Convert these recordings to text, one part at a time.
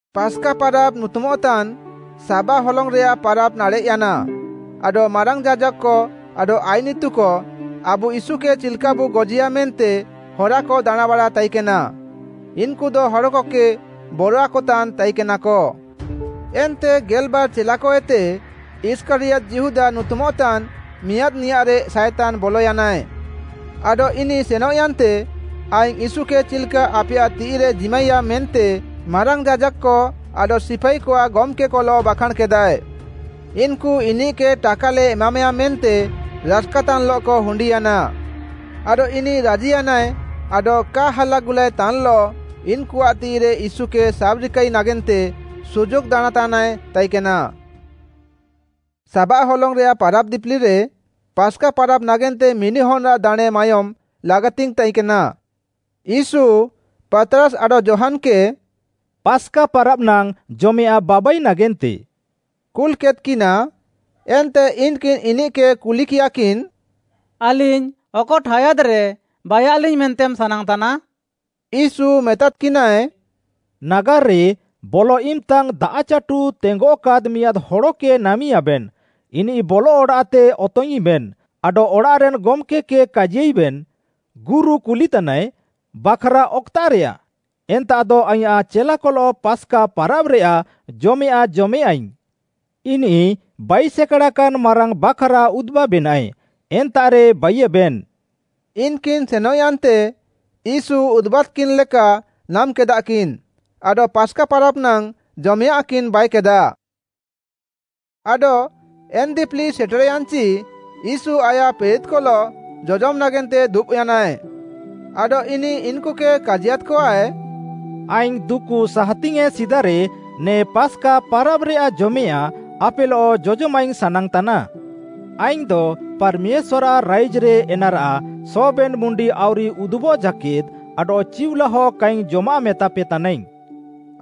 ପାସ୍‌କା ପାରାବ୍‌ ନୁତୁମଃତାନ୍‌ ସାବାଃ ହଲଙ୍ଗ୍‌ରେୟାଃ ପାରାବ୍‌ ନାଡ଼େଃୟାନା, ଆଡଃ ମାରାଙ୍ଗ୍‌ ଯାଜାକ୍‌କ ଆଡଃ ଆଇନ୍‌ ଇତୁକ ଆବୁ ୟୀଶୁକେ ଚିଲ୍‌କାବୁ ଗଜିୟା ମେନ୍ତେ ହରାକ ଦାଣାଁଁବାଡ଼ା ତାଇକେନା, ଇନ୍‌କୁଦ ହଡ଼କକେ ବରଆକତାନ୍‌ ତାଇକେନାକ। ଏନ୍ତେ ଗେଲ୍‌ବାର୍‌ ଚେଲାକଏତେ, ଇଷ୍କାରିୟତ୍‌ ଯିହୁଦା ନୁତୁମଃତାନ୍‌ ମିଆଁଦ୍‌ନିୟାଃରେ ସାଏତାନ୍‌ ବଲୟାନାଏ। ଆଡଃ ଇନିଃ ସେନଃୟାନ୍ତେ ଆଇଙ୍ଗ୍‌ ୟୀଶୁକେ ଚିଲ୍‌କା ଆପେୟାଃ ତିଃଇରେ ଜିମାଇୟା ମେନ୍ତେ ମାରାଙ୍ଗ୍‌ ଯାଜାକ୍‌କ ଆଡଃ ସିପାଇକଆଃ ଗମ୍‌କେକଲଃ ବାଖାଁଣ୍‌କେଦାଏ। ଇନ୍‌କୁ ଟାକାଲେ ଏମାମେୟା ମେନ୍ତେ ରାସ୍‌କାତାନ୍‌ଲଃକ ହୁଣ୍ଡିୟାନା। ଆଡଃ ଇନିଃ ରାଜିୟାନାଏ ଆଡଃ କା ହାଲାଗୁଲାଏତାନ୍‌ଲଃ ଇନ୍‌କୁଆଃ ତିଃଇରେ ୟୀଶୁକେ ସାବ୍‍ରିକାଇ ନାଗେନ୍ତେ ସୁଯୋଗ୍‌ ଦାଣାଁଁତାନାଏ ତାଇକେନା। ସାବାଃ ହଲଙ୍ଗ୍‌ରେୟାଃ ପାରାବ୍‌ ଦିପିଲିରେ, ପାସ୍‌କା ପାରାବ୍‌ ନାଗେନ୍ତେ ମିଣ୍ଡିହନ୍‌ଆଃ ଦାଣେଁ ମାୟୋମ୍‌ ଲାଗାତିଙ୍ଗ୍‌ ତାଇକେନା। ୟୀଶୁ, ପାତ୍‌ରାସ୍‌ ଆଡଃ ଯୋହାନ୍‌କେ “ପାସ୍‌କା ପାରାବ୍‌ ନାଙ୍ଗ୍‌ ଜମେୟାଃଁ ବାବାଇ ନାଗେନ୍ତେ” କୁଲ୍‌କେଦ୍‌କିନା। ଏନ୍ତେ ଇନ୍‌କିନ୍‌ ଇନିଃକେ କୁଲିକିୟାକିନ୍‌, “ଆଲିଙ୍ଗ୍‌ ଅକ ଠାୟାଦ୍‌ରେ ବାଇୟାଲିଙ୍ଗ୍‌ ମେନ୍ତେମ୍‌ ସାନାଙ୍ଗ୍‌ତାନା?” ୟୀଶୁ ମେତାଦ୍‌କିନାଏ, “ନାଗାର୍‌ରେ ବଲଃ ଇମ୍‌ତା ଦାଆଃଚାଟୁ ତେଙ୍ଗଃକାଦ୍‌ ମିଆଁଦ୍‌ ହଡ଼କେ ନାମିଁୟାବେନ୍‌, ଇନିଃ ବଲଃ ଅଡ଼ାଃତେ ଅତଙ୍ଗ୍‌ଇଁବେନ୍‌, ଆଡଃ ଅଡ଼ାଃରେନ୍‌ ଗମ୍‌କେ କେ କାଜିୟାଇବେନ୍, ‘ଗୁରୁ କୁଲିତାନାଏ, ବାଖ୍‌ରା ଅକ୍‌ତାଃରେୟା? ଏନ୍ତାଃଦ ଆଇଁୟାଃ ଚେଲାକଲଃ ପାସ୍‌କା ପାରାବ୍‌ରେୟାଃ ଜମେୟାଁଃ ଜମେୟାଁଇଙ୍ଗ୍‌।’ ଇନିଃ ବାଇସେକାଡ଼ାକାନ୍‌ ମାରାଙ୍ଗ୍‌ ବାଖ୍‌ରା ଉଦୁବାବେନାଏ, ଏନ୍ତାଃରେ ବାଇୟେବେନ୍‌।” ଇନ୍‌କିନ୍‌ ସେନଃୟାନ୍ତେ ୟୀଶୁ ଉଦୁବାଦ୍‌କିନ୍‌ଲେକା ନାମ୍‌କେଦାଃକିନ୍, ଆଡଃ ପାସ୍‌କା ପାରାବ୍‌ ନାଙ୍ଗ୍‌ ଜମେୟାଁଃକିନ୍‌ ବାଇକେଦାଃ। ଆଡଃ ଏନ୍‌ ଦିପିଲି ସେଟେର୍‌ୟାନ୍‌ଚି ୟୀଶୁ ଆୟାଃ ପ୍ରେରିତ୍‌କଲଃ ଜଜମ୍‌ ନାଗେନ୍ତେ ଦୁବ୍‍ୟାନାଏ। ଆଡଃ ଇନିଃ ଇନ୍‌କୁକେ କାଜିୟାଦ୍‌କଆଏ, “ଆଇଙ୍ଗ୍‌ ଦୁକୁ ସାହାତିଙ୍ଗ୍‌ୟେଁ ସିଦାରେ ନେ ପାସ୍‌କା ପାରାବ୍‌ରେୟାଃ ଜମେୟାଃଁ ଆପେଲଃ ଜଜମାଇଙ୍ଗ୍‌ ସାନାଙ୍ଗ୍‌ତାନା। ଆଇଙ୍ଗ୍‌ଦ ପାର୍‌ମେଶ୍ୱାର୍‌ଆଃ ରାଇଜ୍‌ରେ ଏନାରାଃ ସବେନ୍‌ ମୁଣ୍ଡି ଆଉରି ଉଦୁବଃ ଜାକେଦ୍‌ ଆଡଃ ଚିଉଲାହ କାଇଙ୍ଗ୍‌ ଜମାଃ ମେତାପେତାନାଇଙ୍ଗ୍‌।”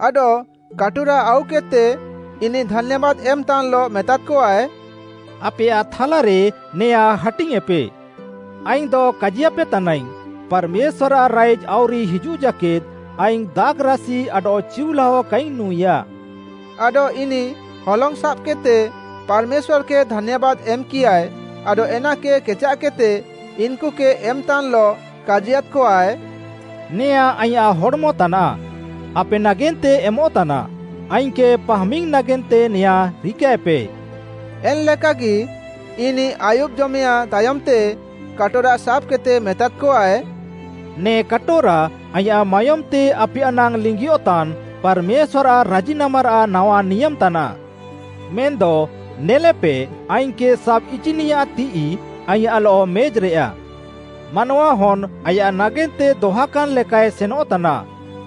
ଆଡଃ କାଟୋରା ଆଉକେଦ୍‌ତେ, ଇନିଃ ଧାନ୍ୟାବାଦ୍‌ ଏମ୍‌ତାନ୍‌ଲଃ ମେତାଦ୍‌କଆଏ, “ଆପେୟାଃ ଥାଲାରେ ନେଆଁଁ ହାଟିଙ୍ଗ୍‌ୟେଁପେ।” ଆଇଙ୍ଗ୍‌ଦ କାଜିୟାପେ ତାନାଇଙ୍ଗ୍‌, “ପାର୍‌ମେଶ୍ୱାର୍‌ଆଃ ରାଇଜ୍‌ ଆଉରି ହିଜୁଃଜାକେଦ୍‌ ଆଇଙ୍ଗ୍‌ ଦାଖ୍‌ରାସି ଆଡଃ ଚିଉଲାଅ କାଇଙ୍ଗ୍‌ ନୁଁଇଆ।” ଆଡଃ ଇନିଃ ହଲଙ୍ଗ୍‌ ସାବ୍‌କେଦ୍‌ତେ, ପାର୍‌ମେଶ୍ୱାର୍‌କେ ଧାନ୍ୟାବାଦ୍ ଏମ୍‌କିୟାଏ ଆଡଃ ଏନାକେ କେଚାଃକେଦ୍‌ତେ ଇନ୍‌କୁକେ ଏମ୍‌ତାନ୍‌ଲଃ କାଜିୟାଦ୍‌କଆଏ, “ନେଆଁଁ ଆଇଁୟାଃ ହଡ଼୍‌ମତାନାଃ, ଆପେ ନାଗେନ୍ତେ ଏମଃତାନା, ଆଇଙ୍ଗ୍‌କେ ପାହାମିଙ୍ଗ୍‌ ନାଗେନ୍ତେ ନେଆଁଁ ରିକାଏପେ।” ଏନ୍‌ଲେକାଗି, ଇନିଃ ଆୟୁବ୍‌ଜମେୟାଃଁ ତାୟମ୍‌ତେ କାଟୋରା ସାବ୍‌କେଦ୍‌ତେ ମେତାଦ୍‌କଆଏ, “ନେ କାଟୋରା ଆଇଁୟାଃ ମାୟୋମ୍‌ତେ ଆପେୟାଃ ନାଙ୍ଗ୍‌ ଲିଙ୍ଗିୟଃତାନ୍ ପାର୍‌ମେଶ୍ୱାର୍‌ଆଃ ରାଜିନାମାରାଃ ନାୱାନିୟାମ୍‌ ତାନାଃ। “ମେନ୍‌ଦ ନେଲେପେ ଆଇଙ୍ଗ୍‌କେ ସାବ୍‌ଇଚିନିୟାଃ ତିଃଇ ଆଇଁୟାଃଲଃ ମେଜ୍‌ରେୟା। ମାନୱାହନ୍‌ ଆୟାଃ ନାଗେନ୍ତେ ଦହାକାନ୍‌ ଲେକାଏ ସେନଃତାନା,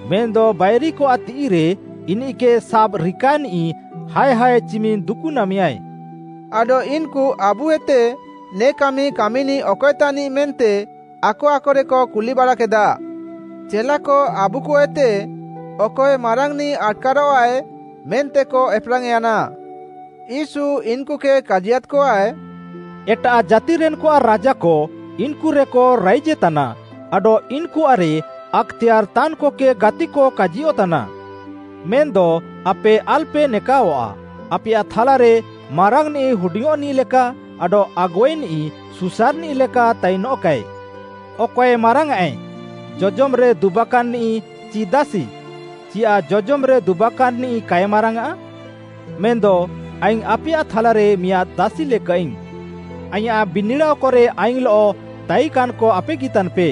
ମେନ୍‌ଦ ବାଇରିକଆଃ ତିଃଇରେ ଇନିଃକେ ସାବ୍‌ରିକାନିଃ ହାୟ୍ ହାୟ୍ ଚିମିନ୍‌ ଦୁକୁନାମେୟାଏ।” ଆଡଃ ଇନ୍‌କୁ ଆବୁଏତେ ନେ କାମି କାମିନିଃ ଅକଏ ତାନିଃ ମେନ୍ତେ ଆକ ଆକରେକ କୁଲିବାଡ଼ାକେଦାଃ। ଚେଲାକ ଆବୁଏତେ ଅକଏ ମାରାଙ୍ଗ୍‌ନିଃ ଆଟ୍‌କାରଃଆଏ ମେନ୍ତେକ ଏପ୍‌ରାଙ୍ଗ୍‌ୟାନା। ୟୀଶୁ ଇନ୍‌କୁକେ କାଜିୟାଦ୍‌କଆଏ, “ଏଟାଃ ଜାତିରେନ୍‌କଆଃ ରାଜାକ ଇନ୍‌କୁରେକ ରାଇଜେତାନା, ଆଡଃ ଇନ୍‌କୁଆଃରେ ଆକ୍‌ତେୟାର୍‌ ତାନ୍‌କକେ ଗାତିକ କାଜିୟଃତାନା। ମେନ୍‌ଦ ଆପେ ଆଲ୍‌ପେ ନେକାଅଆଃ, ଆପେୟାଃ ଥାଲାରେ ମାରାଙ୍ଗ୍‌ନିଃ ହୁଡିଙ୍ଗ୍‌ନିଃଲେକା, ଆଡଃ ଆଗୁଆଇନିଃ ସୁସାର୍‌ନିଃ ଲେକା ତାଇନଃକାଏ। ଅକଏ ମାରାଙ୍ଗ୍‌ଆଏ, ଜଜମ୍‌ରେ ଦୁବାକାନ୍‌ନିଃ ଚି ଦାସି? ଚିୟାଃ ଜଜମ୍‌ରେ ଦୁବାକାନ୍‌ନିଃ କାଏ ମାରାଙ୍ଗ୍‌ଆଁ? ମେନ୍‌ଦ ଆଇଙ୍ଗ୍‌ ଆପେୟାଃ ଥାଲାରେ ମିଆଁଦ୍‌ ଦାସିଲେକାଃଇଙ୍ଗ୍‌। “ଆଇଁୟାଃ ବିନିଡ଼ାଅକରେ ଆଇଙ୍ଗ୍‌ଲଃ ତାଇକାନ୍‌କ ଆପେଗି ତାନ୍‌ପେ।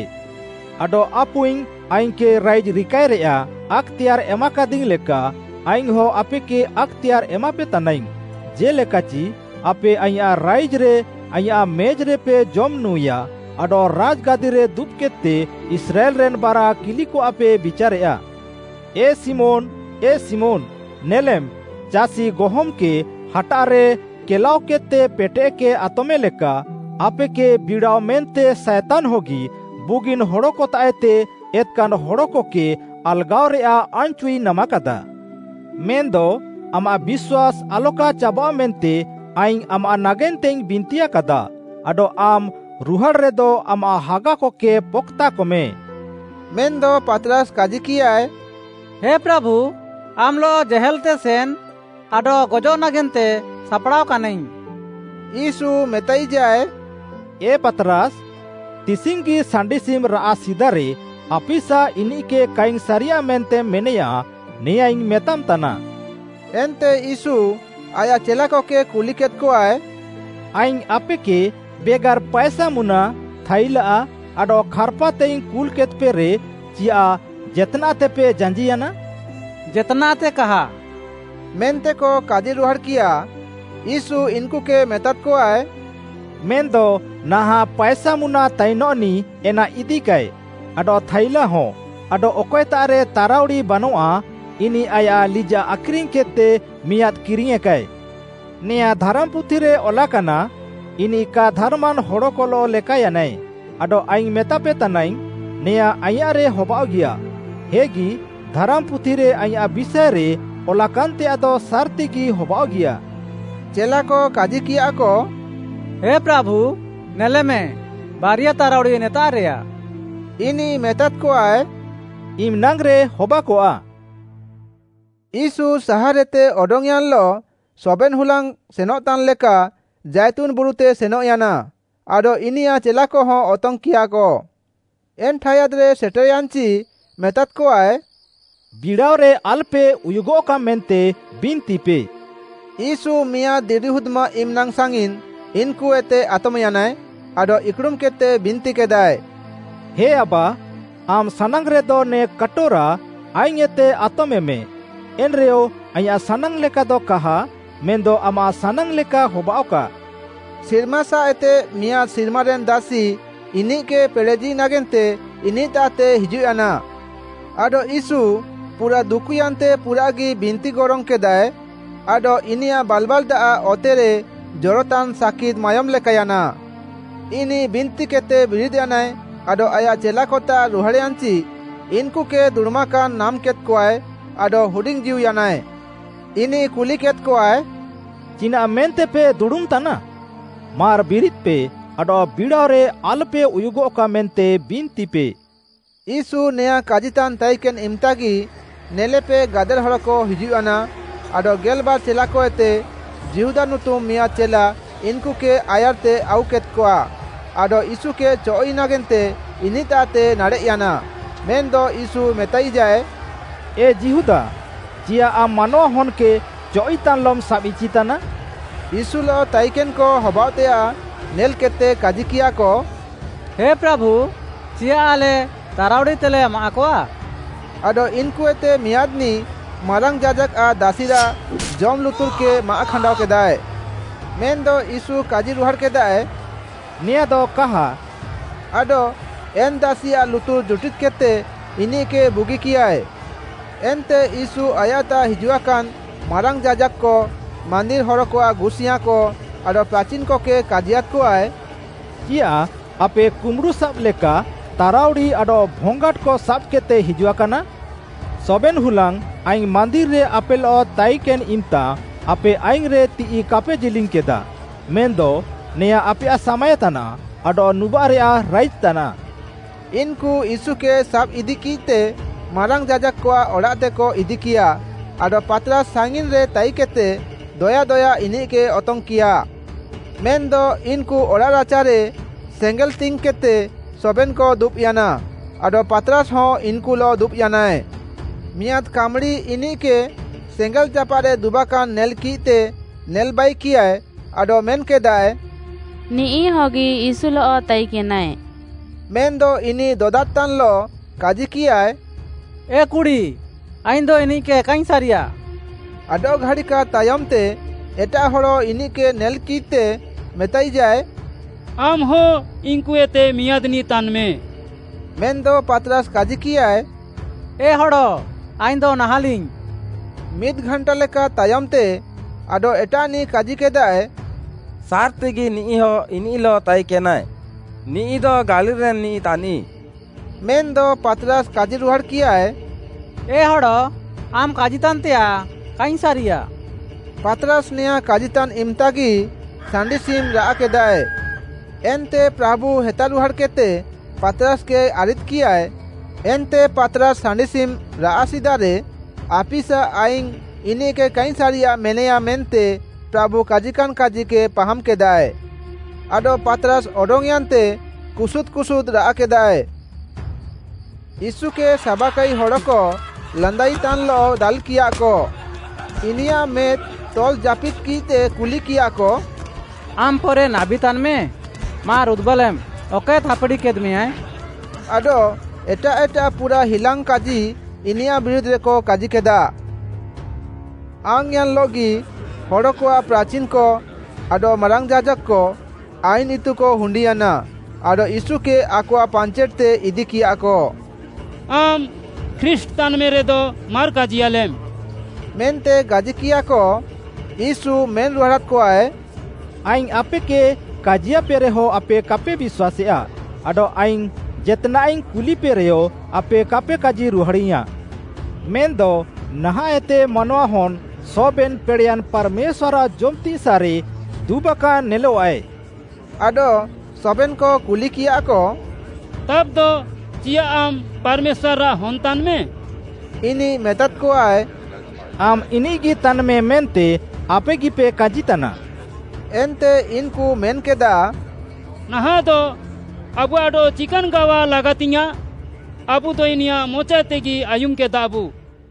ଆଡଃ ଆପୁଇଙ୍ଗ୍‌ ଆଇଙ୍ଗ୍‌କେ ରାଇଜ୍‌ ରିକାଏରେୟାଃ ଆକ୍‌ତେୟାର୍‌ ଏମାକାଦିଙ୍ଗ୍‌ ଲେକା ଆଇଙ୍ଗ୍‌ହଁ ଆପେକେ ଆକ୍‌ତେୟାର୍‌ ଏମାପେତାନାଇଙ୍ଗ୍‌, ଜେ'ଲେକାଚି, ଆପେ ଆଇଁୟାଃ ରାଇଜ୍‌ରେ ଆଇଁୟାଃ ମେଜ୍‌ରେପେ ଜମ୍‌ନୁଁଏୟା ଆଡଃ ରାଜ୍‌ଗାଦିରେ ଦୁବ୍‌କେଦ୍‌ତେ ଇସ୍ରାଏଲ୍‌ରେନ୍‌ ବାରା କିଲିକଆଃପେ ବିଚାରେୟା। “ଏ ଶିମୋନ୍‌, ଏ ଶିମୋନ୍‌, ନେଲେମ୍ ଚାଷି ଗହମ୍‌କେ ହାଟାଃରେ କେଲାଅକେଦ୍‌ତେ ପେଟେଃକେ ଆତମେଲେକା, ଆପେକେ ବିଡ଼ାଅ ମେନ୍ତେ ସାଏତାନ୍‌ହଗି ବୁଗିନ୍‌ ହଡ଼କତାଃଏତେ ଏତ୍‌କାନ୍‌ ହଡ଼କକେ ଆଲ୍‌ଗାଅରେୟାଃ ଆନ୍‌ଚୁଇ ନାମାକାଦା। ମେନ୍‌ଦ ଆମାଃ ବିଶ୍ୱାସ୍‌ ଆଲକା ଚାବାଃଅ ମେନ୍ତେ ଆଇଙ୍ଗ୍‌ ଆମାଃ ନାଗେନ୍ତେଇଙ୍ଗ୍‌ ବିନ୍ତିୟାକାଦାଃ, ଆଡଃ ଆମ୍‌ ରୁହାଡ଼୍‌ରେଦ ଆମାଃ ହାଗାକକେ ପକ୍‌ତାକମେ।” ମେନ୍‌ଦ ପାତ୍‌ରାସ୍‌ କାଜିକିୟାଏ, “ହେ ପ୍ରାଭୁ ଆମ୍‌ଲଃ ଜେହେଲ୍‌ତେ ସେନ୍‌ ଆଡଃ ଗଜଃ ନାଗେନ୍ତେ ସାପ୍‌ଡ଼ାଅକାନାଇଙ୍ଗ୍‌।” ୟୀଶୁ ମେତାଇଜାଏ, “ଏ ପାତ୍‌ରାସ୍‌, ତିସିଙ୍ଗ୍‌ଗି ସାଣ୍ଡିସିମ୍‌ ରାଆଃ ସିଦାରେ ଆପିସା ଇନିଃକେ କାଇଙ୍ଗ୍‌ ସାରିୟାଃ ମେନ୍ତେମ୍‌ ମେନେୟା, ନେଆଁଁଇଙ୍ଗ୍‌ ମେତାମ୍‌ତାନା।” ଏନ୍ତେ ୟୀଶୁ ଆୟାଃ ଚେଲାକକେ କୁଲିକେଦ୍‌କଆଏ, “ଆଇଙ୍ଗ୍‌ ଆପେକେ ବେଗାର୍‌ ପାଏସାମୁନା, ଥାଇଲା, ଆଡଃ ଖାର୍‌ପାତେଇଙ୍ଗ୍‌ କୁଲ୍‌କେଦ୍‌ପେରେ, ଚିୟାଃ ଜେତ୍‌ନାଃତେପେ ଜାଞ୍ଜିୟାନା?” “ଜେତ୍‌ନାଃତେ କାହା” ମେନ୍ତେକ କାଜିରୁହାଡ଼୍‌କିୟା। ୟୀଶୁ ଇନ୍‌କୁକେ ମେତାଦ୍‌କଆଏ, “ମେନ୍‌ଦ ନାହାଁଃ ପାଏସାମୁନା ତାଇନଃନିଃ ଏନା ଇଦିକାଏ, ଆଡଃ ଥାଇଲାହଁ, ଆଡଃ ଅକଏତାଃରେ ତାରାଉଡ଼ି ବାନଆଃ ଇନିଃ ଆୟାଃ ଲିଜାଃ ଆଖ୍‌ରିଙ୍ଗ୍‌କେଦ୍‌ତେ ମିଆଁଦ୍‌ କିରିଙ୍ଗ୍‌ୟେଁକାଏ। ନେଆଁ ଧାରାମ୍‌ପୁଥିରେ ଅଲାକାନା, ‘ଇନିଃ କା ଧାର୍‌ମାନ୍‌ ହଡ଼କଲଃ ଲେକାୟାନାଏ,’ ଆଡଃ ଆଇଙ୍ଗ୍‌ ମେତାପେ ତାନାଇଙ୍ଗ୍‌, ନେଆଁଁ ଆଇଁୟାଃରେ ହବାଅଃଗିୟା। ହେଗି, ଧାରାମ୍‌ପୁଥିରେ ଆଇଁୟାଃ ବିଷାଏରେ ଅଲାକାନ୍‌ତେୟାଃଦ ସାର୍‌ତିଗି ହବାଅଃଗିୟା।” ଚେଲାକ କାଜିକିୟାଃକ, “ହେ ପ୍ରାଭୁ, ନେଲେମେ ବାରିଆ ତାରାଉଡ଼ି ନେତାଃରେୟା।” ଇନିଃ ମେତାଦ୍‌କଆଏ, “ଇମ୍‌ନାଙ୍ଗ୍‌ରେ ହବାକଆଃ।” ୟୀଶୁ ସାହାର୍‌ହେତେ ଅଡଙ୍ଗ୍‌ୟାନ୍‌ଲଃ ସବେନ୍‌ ହୁଲାଙ୍ଗ୍‌ ସେନଃତାନ୍‌ଲେକା ଜାଇତୁନ୍‌ ବୁରୁତେ ସେନଃୟାନା, ଆଡଃ ଇନିୟାଃ ଚେଲାକହ ଅତଙ୍ଗ୍‌କିୟାକ। ଏନ୍‌ ଠାୟାଦ୍‌ରେ ସେଟେର୍‌ୟାନ୍‌ଚି ମେତାଦ୍‌କଆଏ, “ବିଡ଼ାଅରେ ଆଲ୍‌ପେ ଉୟୁଗଃକା ମେନ୍ତେ ବିନ୍ତିପେ।” ୟୀଶୁ ମିଆଁଦ୍‌ ଦିରିହୁଦ୍‌ମାଃ ଇମ୍‌ନାଙ୍ଗ୍‌ ସାଙ୍ଗିନ୍‌ ଇନ୍‌କୁଏତେ ଆତମ୍‌ୟାନାଏ, ଆଡଃ ଇକ୍‌ଡ଼ୁମ୍‌କେଦ୍‌ତେ ବିନ୍ତିକେଦାଏ। “ହେ ଆବା, ଆମ୍‌ ସାନାଙ୍ଗ୍‌ରେଦ ନେ କାଟୋରା ଆଇଙ୍ଗ୍‌ଏତେ ଆତମେଁମେ, ଏନ୍‌ରେୟ ଆଇଁୟାଃ ସାନାଙ୍ଗ୍‌ଲେକାଦ କାହା ମେନ୍‌ଦ ଆମାଃ ସାନାଙ୍ଗ୍‌ଲେକା ହବାଅଃକା।” ସିର୍ମାସାଃଏତେ ମିଆଁଦ୍‌ ସିର୍ମାରେନ୍‌ ଦାସି ଇନିଃକେ ପେଡ଼େଜି ନାଗେନ୍ତେ ଇନିଃତାଃତେ ହିଜୁଃୟାନା। ଆଡଃ ୟୀଶୁ ପୁରାଃ ଦୁକୁୟାନ୍ତେ ପୁରାଃଗି ବିନ୍ତିଗରୋଙ୍ଗ୍‌କେଦାଃଏ ଆଡଃ ଇନିୟାଃ ବାଲ୍‌ବାଲ୍‌ଦାଆଃ ଅତେରେ ଜରତାନ୍‌ ସାକିଦ୍‌ ମାୟୋମ୍‌ଲେକାୟାନା। ଇନିଃ ବିନ୍ତିକେଦ୍‌ତେ ବିରିଦ୍‌ୟାନାଏ ଆଡଃ ଆୟାଃ ଚେଲାକତାଃ ରୁହାଡ଼୍‌ୟାନ୍‌ଚି, ଇନ୍‌କୁକେ ଦୁଡ଼ୁମାକାନ୍‌ ନାମ୍‍କେଦ୍‍କଆଏ, ଆଡଃ ହୁଡିଙ୍ଗ୍‌ଜୀଉୟାନାଏ। ଇନିଃ କୁଲିକେଦ୍‌କଆଏ, “ଚିନାଃମେନ୍ତେପେ ଦୁଡ଼ୁମ୍‌ତାନା? ମାର୍‌ ବିରିଦ୍‌ପେ ଆଡଃ ବିଡ଼ାଅରେ ଆଲ୍‌ପେ ଉୟୁଗଃକା ମେନ୍ତେ ବିନ୍ତିପେ।” ୟୀଶୁ ନେଆଁଁ କାଜିତାନ୍‌ ତାଇକେନ୍‌ ଇମ୍‌ତାଗି ନେଲେପେ ଗାଦେଲହଡ଼କ ହିଜୁଃୟାନା, ଆଡଃ ଗେଲ୍‌ବାର୍‌ ଚେଲାକଏତେ ଯିହୁଦା ନୁତୁମ୍‌ ମିଆଁଦ୍‌ ଚେଲା ଇନ୍‌କୁକେ ଆୟାର୍‌ତେ ଆଉକେଦ୍‌କଆ ଆଡଃ ୟୀଶୁକେ ଚଅଃ'ଇ ନାଗେନ୍ତେ ଇନିଃତାଃତେ ନାଡ଼େଃୟାନା, ମେନ୍‌ଦ ୟୀଶୁ ମେତାଇଜାଏ, “ଏ ଯିହୁଦା, ଚିୟାଃ ଆମ୍‌ ମାନୱାହନ୍‌କେ ଚଅଃ'ଇତାନ୍‌ଲମ୍‌ ସାବ୍‌ଇଚିତାନା?” ୟୀଶୁଲଃ ତାଇକେନ୍‌କ ହବାଅଃତେୟାଃ ନେଲ୍‌କେଦ୍‌ତେ କାଜିକିୟାକ, “ହେ ପ୍ରାଭୁ ଚିୟାଃ ଆଲେ ତାରାଉଡ଼ିତେଲେ ମାଆଃକଆ? ଆଡଃ ଇନ୍‌କୁଏତେ ମିଆଁଦ୍‌ନିଃ ମାରାଙ୍ଗ୍‌ ଯାଜାକ୍‌ଆଃ ଦାସିରାଃ ଜମ୍‌ ଲୁତୁର୍‌କେ ମାଆଃଖାଣ୍ଡାଅକେଦାଏ।” ମେନ୍‌ଦ ୟୀଶୁ କାଜିରୁହାଡ଼୍‌କେଦାଏ, “ନେଆଁଦ କାହା” ଆଡଃ ଏନ୍‌ ଦାସିଆଃ ଲୁତୁର୍‌ ଜୁଟିଦ୍‌କେଦ୍‌ତେ ଇନିଃକେ ବୁଗିକିୟାଏ। ଏନ୍ତେ ୟୀଶୁ ଆୟାଃତାଃ ହିଜୁଆକାନ୍‌ ମାରାଙ୍ଗ୍‌ ଯାଜାକ୍‌କ, ମାନ୍ଦିର୍‌ ହରକଆଃ ଗୁସିୟାଁକ, ଆଡଃ ପ୍ରାଚିନ୍‌କକେ କାଜିୟାଦ୍‌କଆଏ, “ଚିୟାଃ ଆପେ କୁମ୍ବୁଡ଼ୁସାବ୍‌ଲେକା ତାରାଉଡ଼ି ଆଡଃ ଭଙ୍ଗାଟ୍‌କ ସାବ୍‌କେଦ୍‌ତେପେ ହିଜୁଆକାନା? ସବେନ୍‌ ହୁଲାଙ୍ଗ୍‌ ଆଇଙ୍ଗ୍‌ ମାନ୍ଦିର୍‌ରେ ଆପେଲଃ ତାଇକେନ୍‌ଇମ୍‌ତା ଆପେ ଆଇଙ୍ଗ୍‌ରେ ତିଃଇ କାପେ ଜିଲିଙ୍ଗ୍‌କେଦାଃ। ମେନ୍‌ଦ ନେଆଁଁ ଆପେୟାଃ ସାମାଏ ତାନାଃ ଆଡଃ ନୁବାଃରେୟାଃ ରାଇଜ୍‌ତାନାଃ।” ଇନ୍‌କୁ ୟୀଶୁକେ ସାବ୍‌ଇଦିକିଃତେ ମାରାଙ୍ଗ୍‌ ଯାଜାକ୍‌କଆଃ ଅଡ଼ାଃତେକ ଇଦିକିୟାଃ, ଆଡଃ ପାତ୍‌ରାସ୍‌ ସାଙ୍ଗିନ୍‌ରେ ତାଇକେଦ୍‌ତେ ଦୟା ଦୟା ଇନିଃକେ ଅତଙ୍ଗ୍‌କିୟା। ମେନ୍‌ଦ ଇନ୍‌କୁ ଅଡ଼ାଃରାଚାରେ ସେଙ୍ଗେଲ୍‌ତିଙ୍ଗ୍‌କେଦ୍‌ତେ ସବେନ୍‌କ ଦୁବ୍‌ୟାନା, ଆଡଃ ପାତ୍‌ରାସ୍‌ହ ଇନ୍‌କୁଲଃ ଦୁବ୍‌ୟାନାଏ। ମିଆଁଦ୍‌ କାମ୍‌ଡ଼ି ଇନିଃକେ ସେଙ୍ଗେଲ୍‌ଜାପାଃରେ ଦୁବାକାନ୍‌ ନେଲ୍‌କିଃତେ ନେଲ୍‌ବାଇକିୟାଏ ଆଡଃ ମେନ୍‌କେଦାଏ, “ନିଃ ହଗି ୟୀଶୁଲଃ ତାଇକେନାଏ।” ମେନ୍‌ଦ ଇନିଃ ଦଦାଦ୍‌ତାନ୍‌ଲଃ କାଜିକିୟାଏ, “ଏ କୁଡ଼ି ଆଇଙ୍ଗ୍‌ଦ ଇନିଃକେ କାଇଙ୍ଗ୍‌ ସାରିୟାଃ।” ଆଡଃଘାଡ଼ିକାଦ୍‌ ତାୟମ୍‌ତେ ଏଟାଃ ହଡ଼ ଇନିଃକେ ନେଲ୍‌କିଦ୍‌ତେ ମେତାଇଜାଏ, “ଆମ୍‌ହ ଇନ୍‌କୁଏତେ ମିଆଁଦ୍‌ନିଃ ତାନ୍‌ମେ।” ମେନ୍‌ଦ ପାତ୍‌ରାସ୍‌ କାଜିକିୟାଏ, “ଏ ହଡ଼ ଆଇଙ୍ଗ୍‌ଦ ନାହାଁଲିଙ୍ଗ୍‌।” ମିଦ୍‌ଘାଣ୍ଟାଲେକା ତାୟମ୍‌ତେ ଆଡଃ ଏଟାଃନିଃ କାଜିକେଦାଏ, “ସାର୍‌ତିଗି ନିଃହ ଇନିଃଲଃ ତାଇକେନାଏ, ନିଃଦ ଗାଲିଲ୍‌ରେନ୍‌ ନିଃ ତାନିଃ।” ମେନ୍‌ଦ ପାତ୍‌ରାସ୍‌ କାଜିରୁହାଡ଼୍‌କିୟାଏ, “ଏ ହଡ଼, ଆମ୍‌ କାଜିତାନ୍‌ତେୟାଃ କାଇଙ୍ଗ୍‌ ସାରିୟାଃ।” ପାତ୍‌ରାସ୍‌ ନେଆଁଁ କାଜିତାନ୍‌ ଇମ୍‌ତାଗି ସାଣ୍ଡିସିମ୍‌ ରାଆଃକେଦାଏ। ଏନ୍ତେ ପ୍ରାଭୁ ହେତାରୁହାଡ଼୍‌କେଦ୍‌ତେ ପାତ୍‌ରାସ୍‌କେ ଆରିଦ୍‌କିୟାଏ, ଏନ୍ତେ ପାତ୍‌ରାସ୍‌ ସାଣ୍ଡିସିମ୍‌ ରାଆଃ ସିଦାରେ ଆପିସା ଆଇଙ୍ଗ୍‌ ଇନିଃକେ କାଇଙ୍ଗ୍‌ ସାରିୟାଃ ମେନେୟାମ୍‌ ମେନ୍ତେ ପ୍ରାଭୁ କାଜିକାନ୍‌ କାଜିକେ ପାହାମ୍‌କେଦାଏ। ଆଡଃ ପାତ୍‌ରାସ୍‌ ଅଡଙ୍ଗ୍‌ୟାନ୍‌ତେ କୁସୁଦ୍‌ କୁସୁଦ୍‌ ରାଆଃକେଦାଏ। ୟୀଶୁକେ ସାବାକାଇ ହଡ଼କ ଲାନ୍ଦାଇତାନ୍‌ଲଃ ଦାଲ୍‌କିୟାଃକ। ଇନିୟାଃ ମେଦ୍‌ ତଲ୍‌ଜାପିଦ୍‌କିଃତେ କୁଲିକିୟାଃକ, “ଆମ୍‌ ପରେ ନାବୀ ତାନ୍‌ମେ, ମାର୍‌ ଉଦୁବାଲେମ୍‌, ଅକଏ ଥାପ୍‌ଡ଼ିକେଦ୍‌ମେଁୟାଏ।” ଆଡଃ ଏଟାଃ ଏଟାଃ ପୁରାଃ ହିଲାଙ୍ଗ୍‌କାଜି ଇନିୟାଃ ବିରୁଧ୍‌ରେକ କାଜିକେଦା। ଆଙ୍ଗ୍‌ୟାନ୍‌ଲଃଗି ହଡ଼କଆଃ ପ୍ରାଚିନ୍‌କ ଆଡଃ ମାରାଙ୍ଗ୍‌ ଯାଜାକ୍‌କ, ଆଇନ୍‌ ଇତୁକ ହୁଣ୍ଡିୟାନା ଆଡଃ ୟୀଶୁକେ ଆକଆଃ ପାଞ୍ଚେଟ୍‌ତେ ଇଦିକିୟାଃକ। “ଆମ୍‌ ଖ୍ରୀଷ୍ଟ୍‌ ତାନ୍‌ମେରେଦ ମାର୍‌ କାଜିୟାଲେମ୍‌” ମେନ୍ତେ କାଜିକିୟାକ, ୟୀଶୁ ମେନ୍‌ରୁହାଡ଼ାଦ୍‌କଆଏ, “ଆଇଙ୍ଗ୍‌ ଆପେକେ କାଜିୟାପେରେହ ଆପେ କାପେ ବିଶ୍ୱାସେୟା, ଆଡଃ ଆଇଙ୍ଗ୍‌ ଜେତ୍‌ନାଃଇଙ୍ଗ୍‌ କୁଲିପେରେୟ ଆପେ କାପେ କାଜିରୁହାଡ଼ାଇୟାଁଃ। ମେନ୍‌ଦ ନାହାଁଃଏତେ ମାନୱାହନ୍‌ ସବେନ୍‌ ପେଡ଼େୟାନ୍‌ ପାର୍‌ମେଶ୍ୱାର୍‌ଆଃ ଜମ୍‌ତିସାଃରେ ଦୁବାକାନ୍‌ ନେଲଃଆଏ।” ଆଡଃ ସବେନ୍‌କ କୁଲିକିୟାଃକ, “ତାବ୍‌ଦ, ଚିୟାଃ ଆମ୍‌ ପାର୍‌ମେଶ୍ୱାର୍‌ଆଃ ହନ୍‌ ତାନ୍‌ମେ?” ଇନିଃ ମେତାଦ୍‌କଆଏ, “ଆମ୍‌ ଇନିଃଗି ତାନ୍‌ମେ ମେନ୍ତେ ଆପେଗିପେ କାଜିତାନା।” ଏନ୍ତେ ଇନ୍‌କୁ ମେନ୍‌କେଦାଃ, “ନାହାଁଃଦ ଆବୁଆଃ ଆଡଃ ଚିକାନ୍‌ ଗାୱା ଲାଗାତିଙ୍ଗ୍‌ୟାଁଃ? ଆବୁଦ ଇନିୟାଃ ମଚାଏତେଗି ଆୟୁମ୍‌କେଦାଃବୁ।”